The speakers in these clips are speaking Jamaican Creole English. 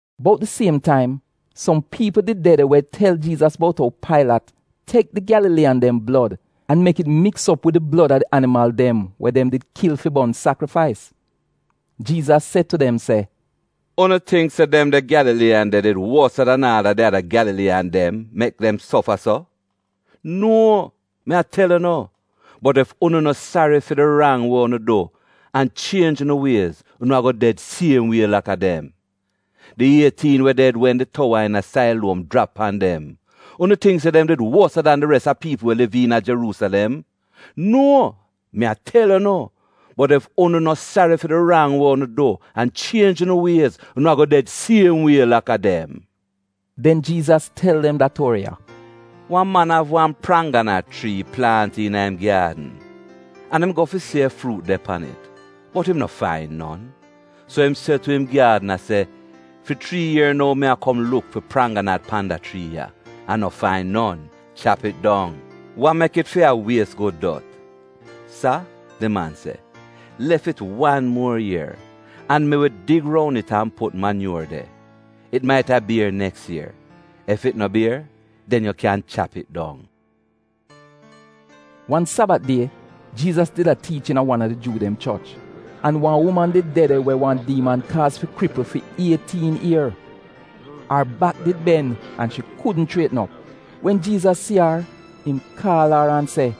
Bout di siem taim, som piipl did de de we tel Jiizas bout ou Pailat tek di Gyalaliiyan dem blod an mek it miks op wid di blod a di animal dem we dem did kil fi bon sakrifais. Jiizas se tu dem se, “Unu tingk se dem de Gyalaliiyan de did wosa dan aal a di ada Gyalaliiyan dem, mek dem sofa so? Nuo! Mi tel unu, bot ef unu no sari fi di rang we unu du an chienj unu wiez, unu ago ded siem wie laka dem. Di ietiin we ded wen di towa iina Sailuom jrap pan dem, unu tingk se dem did wosa dan di res a piipl we liv iina Jeruusilem? Nuo, mi tel unu! Bot ef unu no sari fi di rang we unu du an chienj unu wiez, unu ago ded siem wie laka dem.” Den Jiizas tel dem da tuori ya, “Wan man av wan prangganat chrii plaant iina im gyaadn, an im go fi si ef fruut de pan it, bot im no fain non. So im se tu im gyaadna se, ‘Fi chrii ier nou mi a kom luk fi prangganat pan da chrii ya, an no fain non. Chap it dong! Wa mek it fi a wies gud dot?’ “ ‘Sa,’ di man se, ‘lef it fi wan muo ier, an mi wi dig roun it an put manyuor de. It maita bier neks ier! Ef it no bier, den yu kyan chap it dong.’” Wan Sabat die, Jiizas did a tiich iina wan a di Juu dem choch, an wan uman did de de we wan diiman kaaz fi kripl fi ietiin ier. Ar bak di ben an shi kudn chrietn op. Wen Jiizas si ar, im kaal ar an se,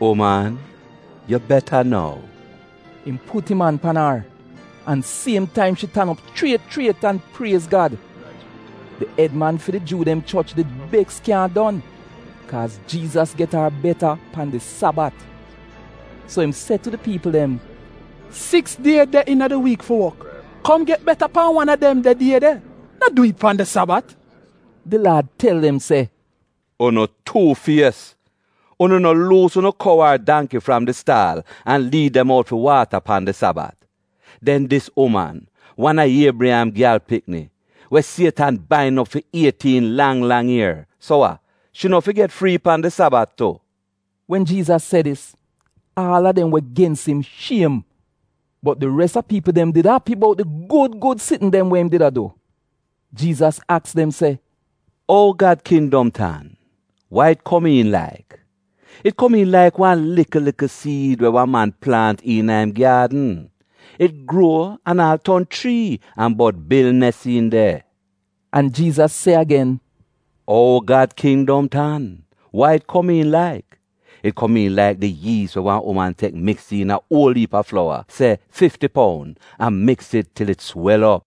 “Uman, yu beta nou.” Im put im an pan ar, an siem taim shi tan op chriet chriet an priez Gad. Di ed man fi di Juu dem choch did beks kyaahn don, kaaz Jiizas get ar beta pan di Sabat. So im se tu di piipl dem, “Siks die de iina di wiik fi wok. Kom get beta pan wan a dem de die de, no dwi'it pan di Sabat.” Di Laad tel im se, “Unu tuu-fies! Unu no luus unu kou ar dangki fram di staal an liid dem out fi waata pan di Sabat? Den dis uman, wan a Iebriyam gyal pikni, we Sietan bain op fi ietiin lang lang ier, so wa, shi no fi get frii pan di Sabat tu?” Wen Jiizas se dis, aal a dem we gens im shiem, bot di res a piipl dem did api bout di gud gud sitn dem we im did a du. Jiizas aks dem se, “Ou Gad kindom tan? Wa it komiin laik? It komiin laik wan likl likl siid, we wan man plaant iina im gyaadn. It gruo an aal ton chrii, an bod bil nes iin de.” An Jiizas se agen, “Ou Gad kindom tan? Wa it komiin laik? It komiin laik di yiis we wan uman tek miks iina uol iip a flowa - se fifti poun - an miks it til it swel op.”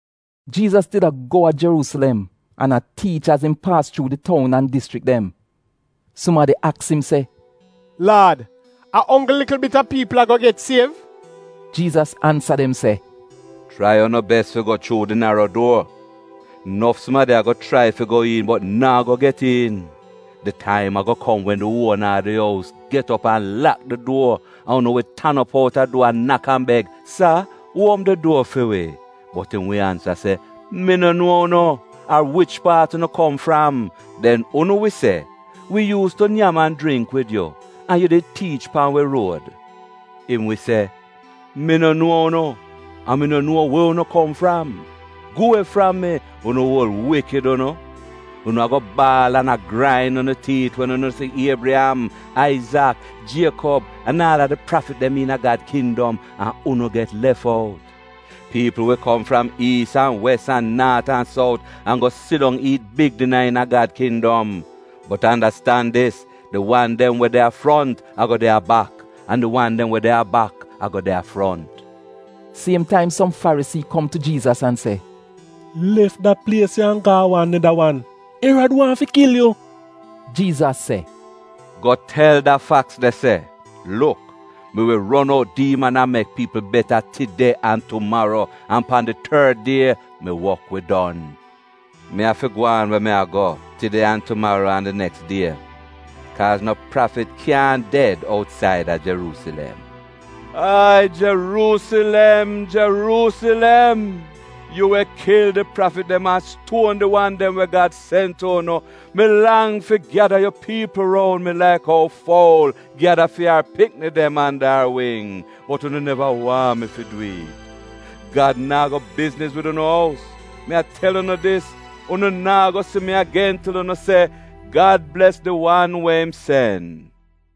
Jiizas did a go a Jeruusilem an a tiich az im paas chuu di toun an dischrik dem. Sumadi aks im se, “Laad, a onggl likl bit a piipl ago get siev?” Jiizas ansa dem se, “Chrai unu bes fi go chuu di naro duor. Nof sumadi ago chrai fi go iin bot naa go get iin. Di taim ago kom wen di uona a di ous get op an lak di duor an unu wi tan op out a duor a nak an beg, ‘Sa, uopm di duor fi wi.’ “Bot im wi ansa se, ‘Mi no nuo unu ar wich paat unu kom fram.’ “Den unu wi se, ‘Wi yuus tu nyam an jringk wid yu, an yu did tiich pan wi ruod.’ Im wi se, ‘Mi no nuo unu an mi no nuo we unu kom fram. Gu we fram mi, unu uol wikid unu.’ “Unu ago a baal an a grain unu tiit, wen unu si Iebriyam, Aizak, Jiekob an aal di prafit dem iina Gad kindom, an unu get lef out. Piipl wi kom fram iis an wes, an naat an sout, an go sidong iit big dina iina Gad kindom. Bot andastan dis, di wan dem we de a front ago de a bak an di wan dem we de a bak ago de a front.” Siem taim som Farisii kom tu Jiizas an se, “Lef da plies ya an go a wan neda wan. Erad waahn fi kil yu.” Jiizas se, “Go tel da faks de se, ‘Luk, mi wi ron out diiman an mek piipl beta tide an tumaro, an pan di tord die, mi wok wi don.’ Mi afi gwaan we mi a go, tide an tumaro an di neks die. Kaaz no prafit kyaahn ded outsaida Jeruusilem! “Ai Jeruusilem, Jeruusilem, yu we kil di prafit dem an stuon di wan dem we Gad sen tu unu, mi lang fi gyada yu piipl roun mi, laik ou foul gyada fi ar pikini dem anda ar wing, bot unu neva waahn mi fi dwi'it! Gad naa go bizniz wid unu ous. Mi a tel unu dis, unu naa go si mi agen til unu se, ‘Gad bles di wan we im sen.’”